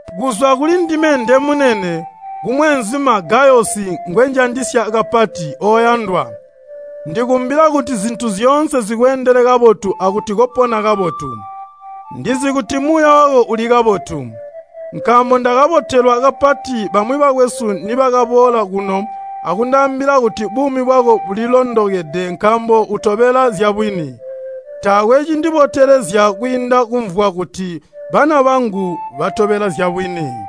Kuzwa kuli ndime ndemunene kumweenzuma Gayosi ngwenjandisya kapati. Oyandwa, ndikumbila kuti zintu zyoonse zikweendele kabotu akuti kopona kabotu. Ndizi kuti muuya wako uli kabotu. Nkaambo ndakabotelwa kapati bamwi bakwesu nibakaboola kuno akundaambila kuti buumi bwako bulilondokede nkaambo utobela zyabwini. Taakwe cindibotelezya kwiinda kumvwa kuti bana bangu batobela zyabwini.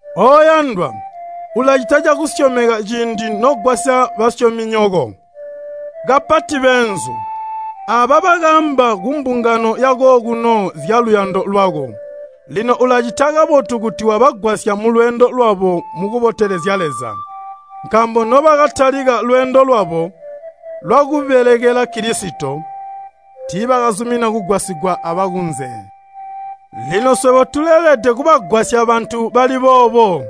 Oyandwa, ulacita cakusyomeka ciindi nogwasya basyominyoko, kapati beenzu. Aaba bakaamba kumbungano yakokuno zyaluyando lwako. Lino ulacita kabotu kuti wabagwasya mulweendo lwabo mukubotelezya Leza. Nkaambo nobakatalika lweendo lwabo lwakubelekela Kilisito, tiibakazumina kugwasigwa abakunze. Lino swebo tuleelede kubagwasya bantu bali boobo,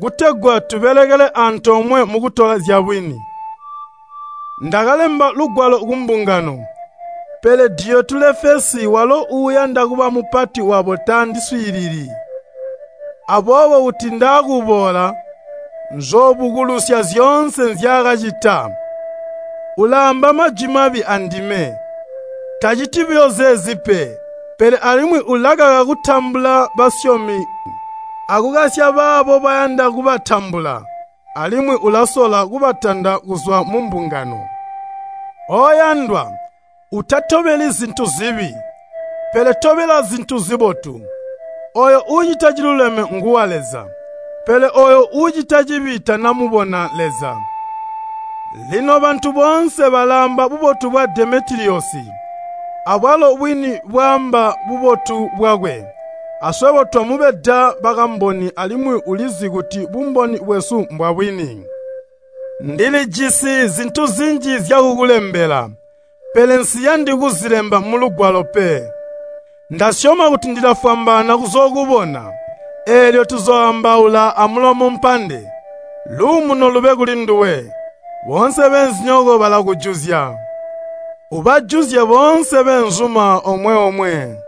kutegwa tubelekele antoomwe mukutola zyabwini. Ndakalemba lugwalo kumbungano, pele Diyotulefesi walo uuyanda kuba mupati wabo tandiswiilili. Aboobo kuti ndaakuboola, nzoobukulusya zyoonse nzyaakacita. Ulaamba majwi mabi andime. Taciti buyo zeezi pe, pele alimwi ulakaka kutambula basyomi akukasya baabo bayanda kubatambula, alimwi ulasola kubatanda kuzwa mumbungano. Oyandwa, utatobeli zintu zibi, pele tobela zintu zibotu. Ooyo uucita ciluleme nguwa Leza, pele ooyo uucita cibi tanamubona Leza. Lino bantu boonse balaamba bubotu bwa Demetiliyosi, abwalo bwini bwaamba bubotu bwakwe. Aswebo twamubeda bakamboni alimwi ulizi kuti bumboni bwesu mbwabwini. Ndilijisi zintu zinji zyakukulembela, pele nsiyandi kuzilemba mulugwalo pe. Ndasyoma kuti ndilafwambaana kuzookubona, eelyo tuzooambaula amulomo mpande. Luumuno lube kuli nduwe. Boonse beenzinyoko balakujuzya. Ubajuzye boonse beenzuma omwe-omwe.